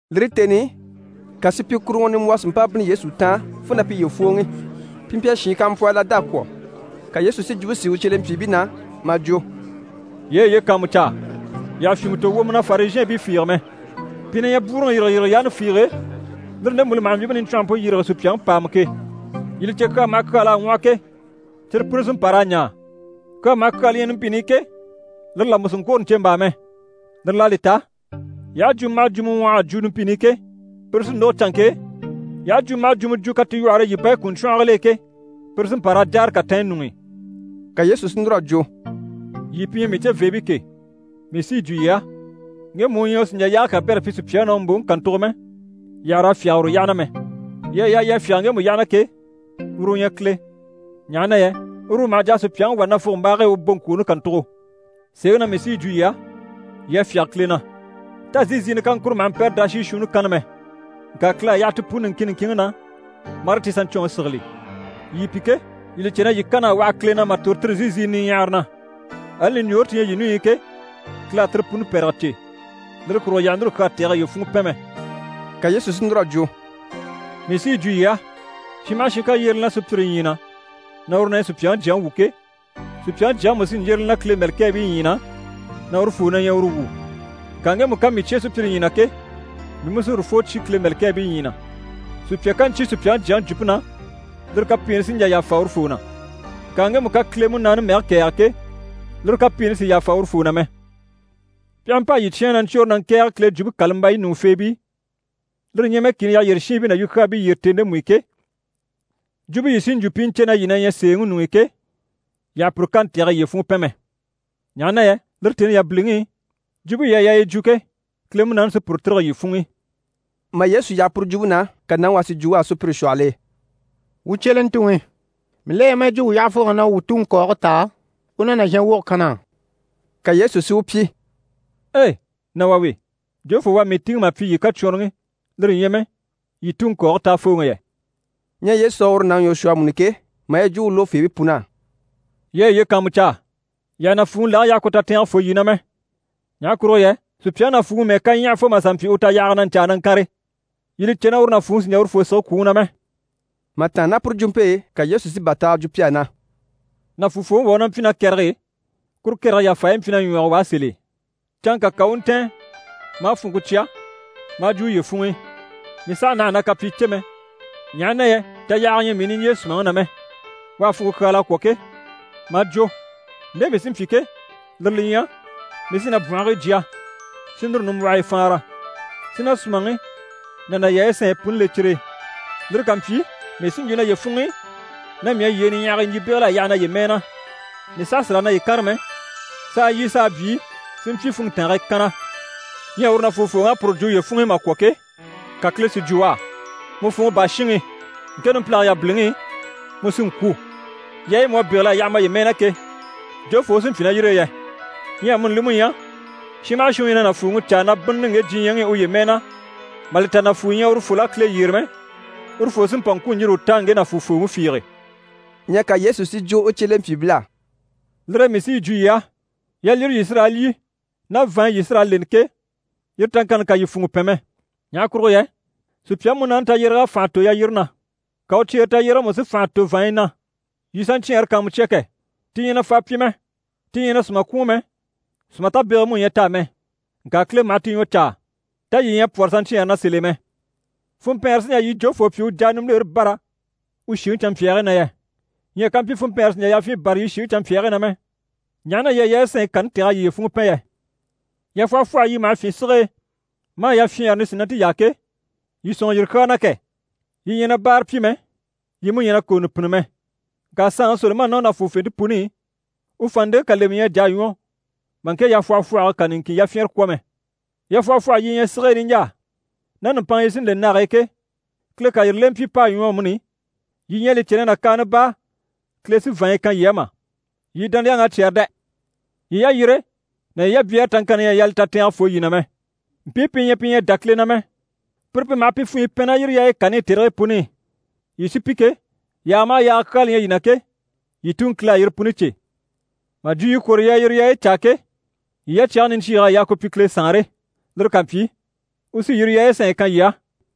Lire tèni i, ka supyikuruŋɔ nimbwɔhɔ si mpa bínni Yesu taan fo na piye fwòoŋi. Pi mpyi a shiin kampwɔhii lada kwɔ̀. Ka Yesu si jwumpe sìi u cyelempyiibii na maa jwo: «Yii a yiye kàanmucaa, yii àha fyìnmɛ tò wwomɔ na Farizhɛɛnbii fiige mɛ. Pi na ɲyɛ bwúuruŋi yîrigeyirige yaani fiige lire ndemu li maha mbyìmpe niɲcwɔnhɔmpe yîrige sùpyaŋi pàama ke. Yii li cè, kyaa maha kyaa l'à ŋwɔhɔ ke, cyire puni sí n‑pa raa ɲaa. Kyaa maha kyaa li ɲyɛ numpini i ke, lire là mú sì n‑kwôro ɲcèmbaa mɛ. Lire l'à li ta, yii aha jwumɔ maha jwumɔ ŋwɔh'a jwo numpini i ke, puru sí n‑lógo canŋke e, yii aha jwumɔ maha jwumɔ jwo katilwɔhɔre e yii bayi kùruɲcwɔngil'e ke, puru sí n‑pa raa jáare katanɲyi ɲuŋ'i.» Ka Yesu si núr'a jwo: «Yii pi ɲyɛ mii ceveebii ke, mii sí yi jwo yii á, ŋgemu u ɲyɛ u sì n‑jà yaage kabɛrɛ pyi sùpyaŋi na u mbòŋi kàntugo mɛ, yii àha raa fyáge uru yyaha na mɛ. Yii à yaa yii a fyáge ŋgemu yyaha na ke, uru u ɲyɛ Kile, ɲaha na yɛ uru u maha jà a sùpyaŋi wà nafugombaage e u boŋkwooni kàntugo. Sèeŋi na mii sí yi jwo yii á, yii a fyáge Kile na. Tá zíiziinɛ kaŋkuro maha mpɛ́rɛ daashii shuunni kanna mɛ? Ŋka Kile à yaha ti puni niŋkin niŋkinŋi na, marii ti saɲcwɔnŋi sigili. Yii pi ke, yii li cè na yii kan'à waha Kile na mà tòro tire zíiziinɛ niɲyahara na. Ali ɲùɲjoore ti ɲyɛ yii ɲùɲyi i ke, Kile à tire puni pɛ̀rɛgɛ cè. Lire kurugo yii àha núru kyaa tɛ̀gɛ yiye funŋɔ pɛn mɛ.» Ka Yesu si núr'a jwo: «Mii sí yi jwo yii á, shin maha shin ká yyére li na sùpyire ɲyii na na uru na ɲyɛ Supyaŋi Jyaŋi wu ke, Supyaŋi Jyaŋi mú sí n‑yyére li na Kile mɛ̀lɛkɛɛbii ɲyii na na urufoo na ɲyɛ uru wu. Ŋka ŋgemu ká mii cyé sùpyire ɲyii na ke, mii mú sí urufoo cyé Kile mɛ̀lɛkɛɛbii ɲyii na. Sùpya ká ɲcyé Supyaŋi Jyaŋi jwumpe na, lire kapiini sí n‑jà yàfa urufoo na. Ŋka ŋgemu ká Kile Munaani mɛge kɛ̀ɛge ke, lire kapiini sì yàfa urufoo na mɛ. Pi aha mpa a yii cyáan na ɲcwôre na ŋkɛ̀ɛge Kile Jwumpe kàlambayi ɲùŋufeebii, lire ɲyɛ mɛ kìni yyaha yyére shiinbii ná yukyaabii yyére tèni ndemu i ke, jwumpe yii sí n‑jwo pi i ɲcè na yii na ɲyɛ sèeŋi ɲuŋ'i ke, yii àha puru kani tɛ̀gɛ yiye funŋɔ pɛn mɛ, ɲaha na yɛ lire tèni yabiliŋi i, jwumpe yii à yaa yii jwo ke, Kile Munaani sí puru tîrige yii funŋ'i.» Mà Yesu yaha puru jwumpe na, ka nàŋi wà si jwo u á sùpyire shwɔhɔl'e: «Wuu cyelentuŋi, mii la ɲyɛ maa yi jwo mii yyahafooŋ'á na u wuu tuŋi kɔɔge táa, u u na nàzhan woge kan na á.» Ka Yesu si u pyi: «Ei! Nà wà we! Jofoo u à mii tìŋɛ mà pyi yii kacwɔnrɔŋi, lire ɲyɛ mɛ yii tuŋi kɔɔge táafooŋi yɛ?» Ɲyɛ Yesu à uru nàŋi ɲwɔ shwɔ amuni ke, maa yi jwo u lógofeebii pun'á: «Yii a yiye kàanmucaa, yii àha nàfuuŋi lage yaha ku tatɛɛngɛ fô yii na mɛ. Ɲaha kurugo yɛ sùpyaŋi nàfuuŋi mɛ́ɛ ká ɲyaha fo mà sà mpyi u tayahaga na ɲcaa na ŋkànre, yii li cè na uru nàfuuŋi sì n‑jà urufoo sige kwùŋi na mɛ.» Mà tàanna ná puru jwumpe e, ka Yesu sí bàtaaga jwo pi á na: «Nàfuufooŋi wà u ná mpyi ná kɛrɛge e, kuru kɛrɛge yafaayi mpyi na ɲwɔge u á sèl'e. Canŋka ka u u ntɛ̀ɛn maa funŋke cya maa jwo uye funŋ'i “Mii sàha naha na kapyii cè mɛ, ɲaha na yɛ tayahaga ɲyɛ mii niɲjyee sùmaŋi na mɛ.” U à funŋke kyáala a kwɔ̀ ke, maa jwo “Nde mii sí n‑pyi ke, lire li ɲyɛ, mii sí na bwɔ̀nhigii jya, si núru nimbwɔhii faanra, si na sùmaŋi ná na yaayi sanɲyi puni le cyire e. Lire ká mpyi, mii sí n‑jwo naye funŋ'i, na mii à yyee niɲyahagii ɲjyì bégel'a yaha naye mɛɛ na. Mii saha sì raa naye kànre mɛ, s'a lyî s'a byii si mpyi funntange e kanna.” Ɲyɛ uru nàfuufooŋ'à puru jwo uye funŋ'i mà kwɔ̀ ke, ka Kile si jwo u á “Mu funŋɔ baa shinŋi! Ŋke numpilage yabiliŋi i, mu sí n‑kwû. Yaayi mu à bégel'a yaha maye mɛɛ na ke, jofoo u sí n‑pyi ná yire e yɛ?” Ɲyɛ amuni li mú ɲyɛ, shin maha shin u ɲyɛ na nàfuuŋi caa na bínnini ŋge diɲyɛŋi i uye mɛɛ na, mà li ta nàfuu ɲyɛ urufol'á Kile yyére mɛ, urufoo sí n‑pa n‑kwû n‑yîri u taan ŋge nàfuufooŋi fiige.» Ɲyɛ ka Yesu si jwo u cyelempyiibil'á: «Lire e mii sí yi jwo yii á, yalyire yii sí raa lyî ná vàanɲyi yii sí raa leni ke, yire taŋkanni kà yii funŋɔ pɛn mɛ. Ɲaha kurugo yɛ sùpyaŋi múnaani tayyéreg'à fànha tò yalyire na, ka u cyeere tayyérege mú si fànha tò vàanɲyi na. Yii saɲcyɛɛnre kàanmucya kɛ! Ti ɲyɛ na faa pyi mɛ, ti ɲyɛ na sùma kwùun mɛ, sùma tabegege mú ɲyɛ t'á mɛ. Ŋka Kile maha ti ɲwɔ caa. Tá yii ɲyɛ a pwɔ́rɔ saɲcyɛɛnre na sèl'e mɛ? Funmpɛɛnre sí n‑jà yii jofoo pyi u jà a nimbilere bâra u shìŋi canmpyaagii na yɛ? Ɲyɛ kampyi funmpɛɛnre sì n‑jà yafyin bâra yii shìŋi canmpyaagii na mɛ, ɲaha na yii à yaayi sanɲyi kani tɛ̀g'a yiye funŋɔ pɛn yɛ? Yafwɔhɔfwɔhɔyi yi maha fyîn sige e maa yafyɛɛnre nisinante yaa ke, yii sɔ̂nŋɔ yire kyaa na kɛ! Yi ɲyɛ na báara pyi mɛ, yi mú ɲyɛ na kòonɔ pînni mɛ. Ŋka saanŋi Solomani ná u nàfuufente puni i, u vàanndeŋke kà lemɛ ɲyɛ a jà a ɲwɔ mà ŋke yafwɔhɔfwɔhɔge kà niŋkin yafyɛnrɛ kwɔ̀ mɛ. Yafwɔhɔfwɔhɔyi yi ɲyɛ sige e niɲjaa, ná nùmpanŋa yi sí n‑le nage e ke, Kile ká yire lemɛ pyi p'à ɲwɔ amuni, yii ɲyɛ a li cè na nàkaana baa Kile sí vàanɲyi kan yii á mà? Yii dániyaŋ'à cyɛ́rɛ dɛ! Yii yalyire ná yii yabyɛɛre taŋkanni ɲyɛ a yaa li tatɛɛnge fô yii na mɛ. Mpii pi ɲyɛ pi ɲyɛ a dá Kile na mɛ, pire pi maha funɲyi pɛn ná yire yaayi kani i tèrigii puni i. Yii sí pi ke, yaaga maha yaaga kyaa li ɲyɛ yii na ke, yii Tuŋi Kile à yire puni cè. Mà jwo yii kwôro yii a yire yaayi caa ke, yii yacyage niɲcyiig'à yaa ku pyi Kile Saanre. Lire ká mpyi, u sí yire yaayi sanɲyi kan yii á.»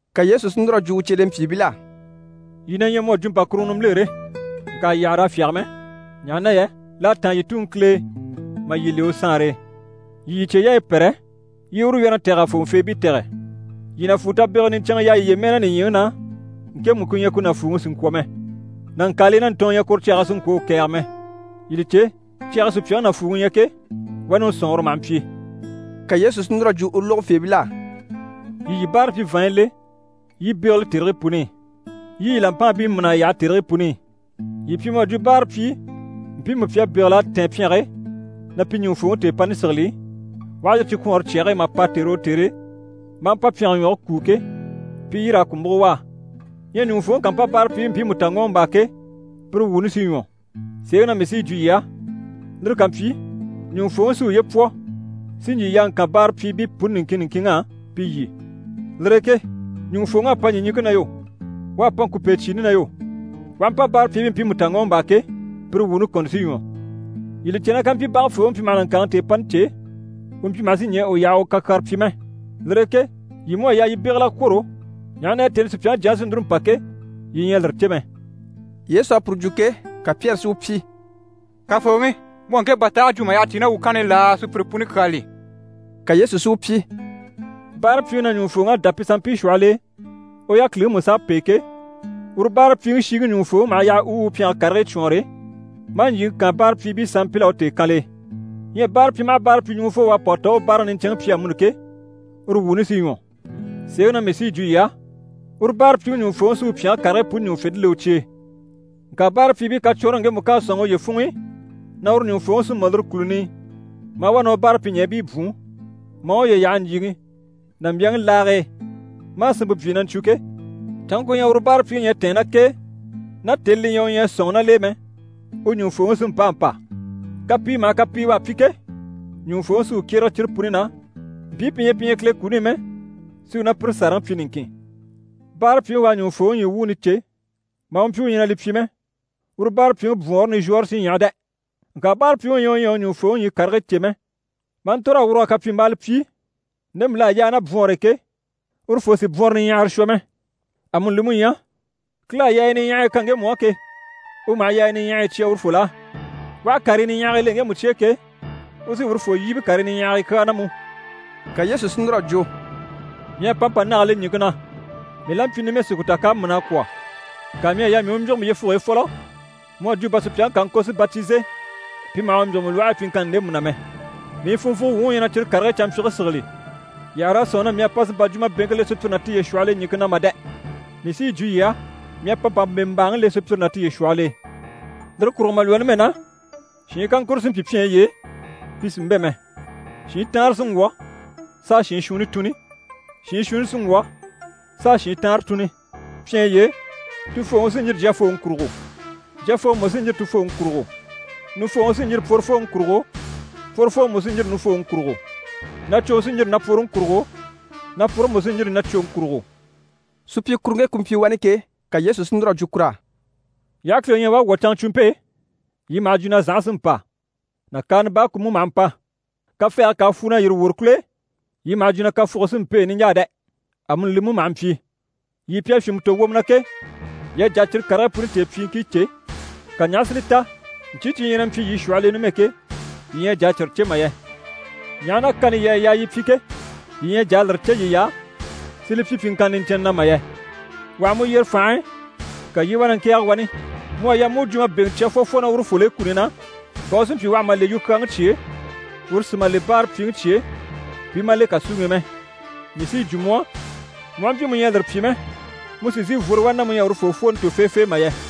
Ka Yesu si núr'a jwo u cyelempyiibil'á: «Yii na ɲyɛ mu à jwo mpàkuruŋɔ nimbilere, ŋka yii àha raa fyáge mɛ, ɲaha na yɛ l'à táan yii Tuŋi Kile e mà yii le u Saanre e. Yii yii cyeyaayi pɛ́rɛ, yii i uru wyɛ́rɛŋi tɛ̀g'a fòŋɔfeebii tɛ̀gɛ. Yii nàfuu tabegege niɲcɛnŋɛ yaa yiye mɛɛ na nìɲyiŋi na, ŋkemu ku ɲyɛ ku nàfuuŋi sì n‑kwɔ̀ mɛ. Nàŋkaalii ná ntɔɔn ɲyɛ kuru cyage e si ŋkwɔ̀ u kɛ̀ɛge mɛ. Yii li cè, cyage e sùpyaŋi nàfuuŋi ɲyɛ ke, wani u sɔ̀nŋɔre maha mpyi.» Ka Yesu sí núr'a jwo u lógofeebil'á: «Yii yii báarapyi vàanɲyi le yii i bégele tèrigii puni i. Yii i yii làmpaabii mîn'a yaha tèrigii puni i. Yii pyi mu à jwo báarapyii mpiimu pi à bégel'a tɛ̀ɛn pyɛnge e, na pi ɲùŋufooŋi tèepani sigili, u aha yîri cikwɔɔnre cyage e, mà pa tère o tère e, maa mpa pyɛnge ɲwɔge kúu ke, pi i yîr'a ku múgo u á. Ɲyɛ ɲùŋufooŋi ká mpa báarapyiibii mpiimu ta ŋɔ́ɔmbaa ke, pire wuuni sí ɲwɔ. Sèeŋi na mii sí yi jwo yii á, lire ká mpyi, ɲùŋufooŋi sí uye pwɔ si ɲjyì yaa ŋkan báarapyiibii puni niŋkin niŋkinŋ'á, pi lyî. Lire e ke ɲùŋufooŋ'à pa ɲìɲiŋke na yo, u à pa ŋkùpecyiini na yo, u aha mpa báarapyiibii mpiimu ta ŋɔ́ɔmbaa ke, pire wuuni kɔni sí ɲwɔ. Yii li cè na kàmpyi bage fooŋi mpyi maha nàŋkaaŋi tèepani cè, u mpyi maha sí ɲɛɛ u yaha u kakyaare pyi mɛ. Lire e ke yii mú à yaa yii bégel'a kwôro, ɲaha na yɛ tèni i Supyaŋi Jyaŋi sí núru n‑pa ke, yii ɲyɛ a lire cè mɛ.» Yesu à puru jwo ke, ka Pyɛri si u pyi: «Kafooŋi, mu à ŋke bàtaage jwo mà yyaha tíi ná wuu kanni i laa, sùpyire puni kyaa li?» Ka Yesu si u pyi: «Báarapyiŋi na, ɲùŋufooŋ'à dá pi sanmpii shwɔhɔl'e, u yákiliŋi mú s'à pêe ke, uru báarapyiŋi shiŋi ɲùŋufooŋi maha yaha u u pyɛnge karigii cwɔɔnre, maa ɲjyìŋi kaan báarapyiibii sanmpil'á u tèekanl'e. Ɲyɛ báarapyi maha báarapyi ɲùŋufoo, u à pa u ta u u báaraŋi niɲcɛnŋi pyi amuni ke, uru wuuni sí ɲwɔ. Sèeŋi na mii sí yi jwo yii á, uru báarapyiŋi ɲùŋufooŋi sí u pyɛnge karigii puni ɲùŋufente le u cye e. Ŋka báarapyiibii kacwɔnrɔŋi ŋgemu ká a sɔ̂nŋi uye funŋ'i na uru ɲùŋufooŋi sí mɔ lire kùluni i, maa wá na u báarapyiɲɛɛbii bwùun, maa uye yaha ɲjyìŋi ná mbyaŋi laage e, maa sinmpe byii na ɲcwo ke, canŋke ku ɲyɛ uru báarapyiŋi ɲyɛ a tɛ̀ɛn ná k'e ná tèni li ɲyɛ u ɲyɛ a sɔ̂nŋɔ ná l'e mɛ, u ɲùŋufooŋi sí n‑pâa n‑pa. Kapii maha kapii u à pyi ke, ɲùŋufooŋi sí u kyérege cyire puni na, mpii pi ɲyɛ pi ɲyɛ Kile kuni i mɛ, si u ná pire sàraŋi pyi niŋkin. Báarapyiŋi u à ɲùŋufooŋi ɲyii wuuni cè maa mpyi u ɲyɛ na li pyi mɛ, uru báarapyiŋi bwɔɔnre nizhwɔɔre sí ɲyaha dɛ! Ŋka báarapyiŋi u ɲyɛ u ɲyɛ a u ɲùŋufooŋi ɲyii karigii cè mɛ, maa ntòr'a wurug'a kapyimbaala pyi ndemu l'à yaa ná bwɔnr'e ke, urufoo sì bwɔnrɔ niɲyahara shwɔ mɛ. Amuni li mú ɲyɛ, Kile à yaaya niɲyahaya kan ŋgemu á ke, u maha yaaya niɲyahaya cya urufol'á. U aha karii niɲyahaɲyahagii le ŋgemu cye e ke, u sí urufoo yíbe karii niɲyahaɲyahagii kyaa na mú.» Ka Yesu sí núr'a jwo: «Mii à pa mpa nage le ɲìŋke na. Mii la mpyi numɛ si ku ta k'à mîn'a kwɔ̀. Ŋka mii à yaa mii u mbyîgimɛ yyefuge e fɔlɔ, mu à jwo bà sùpyaŋi ká a ŋko si batize pi maha u mbyîgimɛ lwɔhe e pyiŋkanni ndemu na mɛ. Mii funvwugo wuŋi u ɲyɛ na cyire karigii canmpyige sigili. Yii àha raa sɔ̂nŋi na mii à pa si mpa jwumabeŋke le sùpyire ná tiye shwɔhɔl'e ɲìŋke na mà dɛ! Mii sí yi jwo yii á, mii à pa mpa mbèmbaaŋi le sùpyire ná tiye shwɔhɔl'e. Lire kurugo mà lwɔ́ numɛ na, shiin kaŋkuro sí n‑pyi pyɛnyi y'e, pi sì n‑bɛ̂ mɛ. Shiin taanre sí n‑wwɔ̀ s'a shiin shuunni tùnni, shiin shuunni sí n‑wwɔ̀ s'a shiin taanre tùnni. Pyɛnyi y'e, tufooŋi sí n‑yîri jyafooŋi kurugo, jyafooŋi mú sí n‑yîri tufooŋi kurugo. Nufooŋi sí n‑yîri pworofooŋi kurugo, pworofooŋi mú sí n‑yîri nufooŋi kurugo. Nacwoŋi sí n‑yîri napworoŋi kurugo, napworoŋi mú sí n‑yîri nacwoŋi kurugo.» Supyikuruŋke ku mpyi wani ke, ka Yesu si núr'a jwo kur'á: «Yii aha kileŋi ɲya u à wwɔ̀ canŋacwumpe e, yii maha jwo na zànha sí n‑pa, nàkaana baa ku mú maha mpa. Kafɛɛge ká a fwu na yîri wòro kùl'e, yii maha jwo na kafuge sí n‑pêe niɲjaa dɛ! Amuni li mú maha mpyi. Yii pi à fyìnmɛ tò wwomɔ na ke, yii à jà a cyire karigii puni tèepyiiŋkii cè, ka ɲaha si li ta ɲcyii cyi ɲyɛ na mpyi yii shwɔhɔl'e numɛ ke, yii ɲyɛ a jà a cyire cè mà yɛ? Ɲaha na kani yii à yaa yii pyi ke, yii ɲyɛ a jà a lire cè yiy'á si li pyi pyiŋkanna niɲcɛnnɛ na mà yɛ? Wà ha mu yyere fànhe e, ka yii i wá na ŋkɛ̀ɛge wani, mu à yaa mu u jwumabeŋɛ cya fwɔfwɔ ná urufol'e kuni na, bà u si mpyi u àha ma le yukyaaŋi cye e, uru si ma le u báarapyiŋi cye e, pi i ma le kàsuŋi i mɛ. Mii sí yi jwo mu á, mu aha mpyi mu ɲyɛ a lire pyi mɛ, mu sì n‑sìi n‑fworo wani ná mu ɲyɛ a urufoo fwooni tò feefee mà yɛ!»